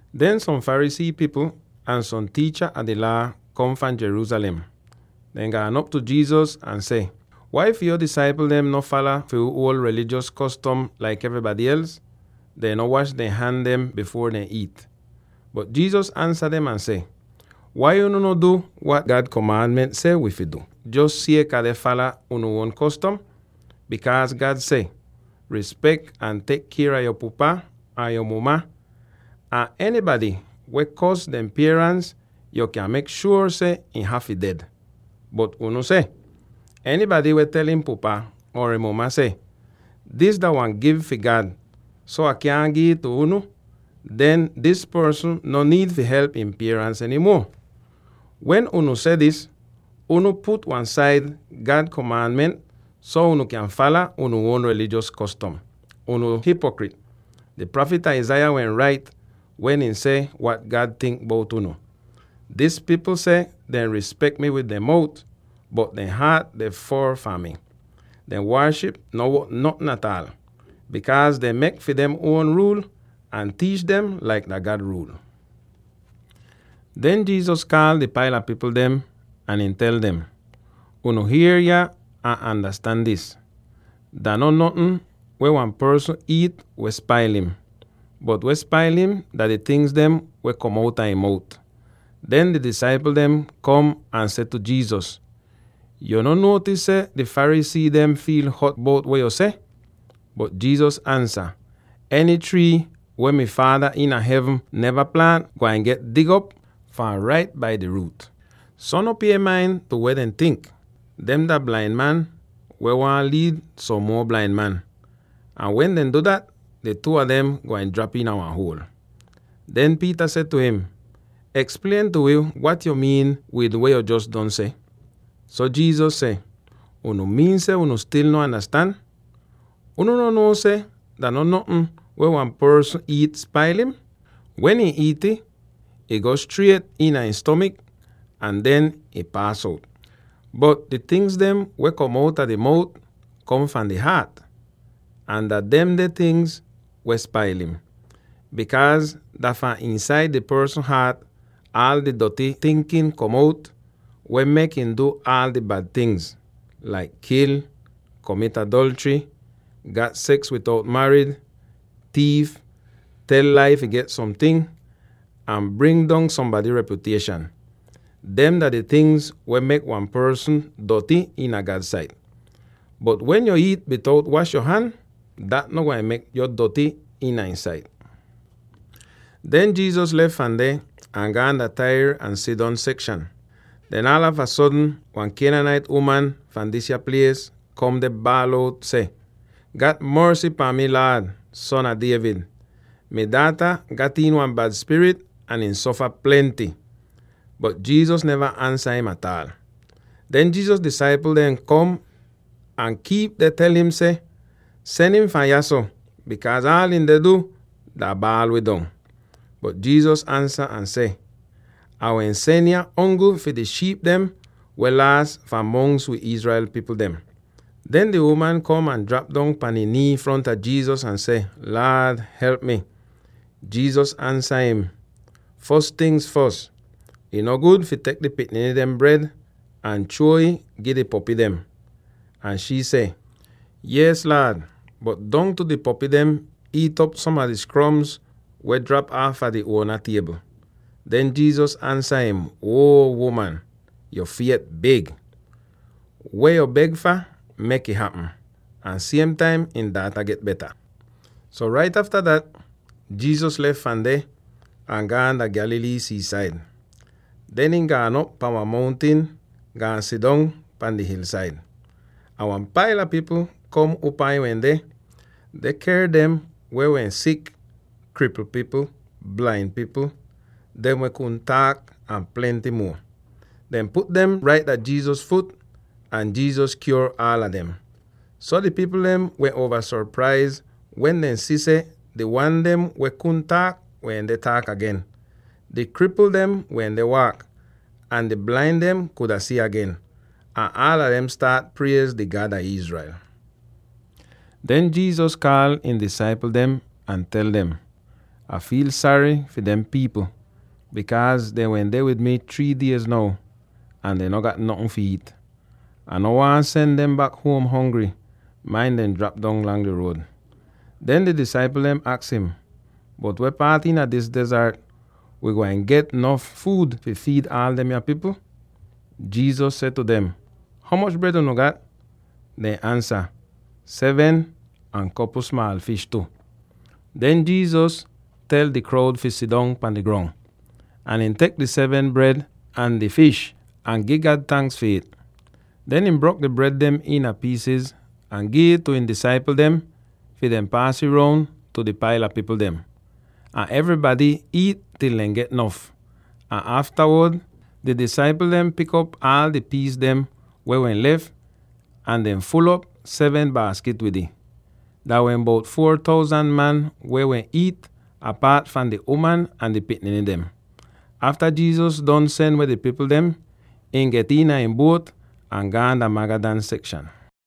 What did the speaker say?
Den som Pharisee pipl ahn som tiicha a di Laa kom fahn Jerusalem; dehn gaan op tu Jesus ahn seh, “Wai fi yo disaipl dem no fala fi wi uol taim rilijos kostom laik evrybady els? Dehn no wash dehn han dem bifuor dehn iit!” Bot Jesus ansa dem ahn seh, “Wai unu no du wat God seh, jos sieka deh fala unu uon kostom? Bikaaz God seh, ‘Rispek ahn tek kier a yo pupa ahn yo muma,’ ahn, ‘Enybady weh kors dehn pierans, yo kyan mek shuor seh ihn hafy ded.’ Bot unu seh, ‘Enybady weh tel ihn pupa or ihn muma seh, “Dis dah wan gif fi God, so Ah kyaahn gi'ih tu unu,” den dis porsn no niid fi help ihn pierans eny muo.’ Wen unu seh dis, unu put wan-said God komaanment, so unu kyan fala unu uon rilijos kostom. Unu hipokrit! Di prafit Isaiah wehn rait wen ihn seh wat God tink bout unu: ‘Dis pipl seh dehn rispek mi wid dehn mout, bot dehn haat deh foor fahn mi. Dehn waaship no wot notn ataal, bikaaz dehn mek fi dem uon ruul, ahn tiich dem laik dah God ruul.’” Den Jesus kaal di paila pipl dem ahn ihn tel dem, “Unu hier yah ahn andastan dis: Dah no notn weh wan porsn iit weh spail im; bot weh spail im dah di tingz dem weh kom outa ihn mout.” Den di disaipl dem kom ahn seh tu Jesus, “Yuu no nuotis seh di Pharisee dehn wehn fiil hot bout weh yo seh?” Bot Jesus ansa, “Eny trii weh mi Faada iina hevn neva plaant gwain get dig op fahn rait bai di ruut. So no pie main tu weh dem tink! Dehn dah blain man weh waahn liid som muo blain man, ahn wen dehn du dat, di two a dem gwain drap iina wan huol!” Den Peter seh tu im, “Eksplien tu wi wat yo miin wid weh yo jos don seh.” So Jesus seh, “Unu miin seh unu stil no andastan? Unu no nuo seh dah no notn weh wan porsn iit spail im? Wen ihn iit'ih, ih go striet iina ihn stomik ahn den ih paas out. Bot di tingz dem weh kom outa di mout kom fahn di haat, ahn dah demde tingz weh spail im. Bikaaz dah fahn iinsaida di porsn haat aal di doty tinkin kom out weh mek im du aal di bad ting dem, laik kil, komit adolchry, gat seks bitout marid, tiif, tel lai fi get somting, ahn bring dong sombady repyutieshan. Dem dah di tingz dem weh mek wan porsn doty iina God sait. Bot wen yo iit bitout wash yo han, dat no gwain mek yo doty iina ihn sait.” Den Jesus lef fahn deh ahn gaan dah Tyre ahn Sidon sekshan. Den aalava sodn wan Canaanite uman fahn disya plies kom deh baal out seh, “Gat morsy pahn mi, Laad, Son a David! Mi daata gat iin wan bad spirit ahn ihn sofa plenty!” Bot Jesus neva ansa im ataal. Den Jesus disaipl dehn kom ahn kiip deh tel im seh, “Sen im fahn yahso, bikaaz aal ihn deh du dah baal wi dong.” Bot Jesus ansa ahn seh, “Ah wehn sen yah ongl fi di shiip dem weh laas fahn mongs fi wi Israel pipl dem.” Den di uman kom ahn drap dong pahn ihn nii fronta Jesus ahn seh, “Laad, help mi!” Jesus ansa im, “Fos tingz fos; ih no gud fi tek di pikniny dehn bred ahn chruo'ih, gi di popy dem.” Ahn shii seh, “Yees, Laad, bot dongtu di popy dem iit'op som a di skroms weh drap aafa dehn uona tiebl.” Den Jesus ansa im, “Uo uman, yo fiet big! Weh yo beg fah, mek'ih hapm.” Ahn siem taim ihn daata get beta. So rait afta dat Jesus lef fahn deh, ahn gaan dah Galilee sii-said. Den ihn gaan op pahn wan mountin, gaan sidong pahn di hilsaid. Ahn wan paila pipl kom upaa ihn wende, deh ker dem weh wehn sik: kripl pipl, blain pipl, dem weh kudn taak, ahn plenty muo. Dehn put dem rait dah Jesus fut, ahn Jesus kyuor aala dem! So di pipl dehn wehn uova sopraiz wen dehn si seh, di wan dem weh kudn taak wende taak agen, di kripl dem wende waak, ahn di blain dem kuda si agen. Ahn aala dem staat priez di God a Israel. Den Jesus kaal ihn disaipl dem ahn tel dem, “Ah fiil sary fi dehn pipl, bikaaz dehn wende wid mi three diez now, ahn dehn no gat notn fi iit. Ah no waahn sen dem bak huom hongry, main dehn drap dong lang di ruod.” Den di disaipl dem aks im, “Bot weh paat iina dis dezart wii gwain get nof fuud fi fiid aal demya pipl?” Jesus seh tu dem, “Ho moch bred unu gat?” Dehn ansa, “Seven, ahn kopl smaal fish tu.” Den Jesus tel di kroud fi sidong pahn di grong, ahn ihn tek di seven bred ahn di fish, ahn gi God tanks fi it. Den ihn brok di bred dem iina piisiz ahn gi'ih tu ihn disaipl dem fi dehn paas ih roun tu di paila pipl dem. Ahn evrybady iit til dehn get nof, ahn aftawod di disaipl dehn pik op aal di piis dem weh wehn lef, ahn dehn ful'op seven baaskit wid ih! Dah wehn bout four thousand man weh wehn iit, apaat fahn di uman ahn di pikniny dem. Afta Jesus don sen weh di pipl dem, ihn get iina ihn buot ahn gaan dah Magadan sekshan.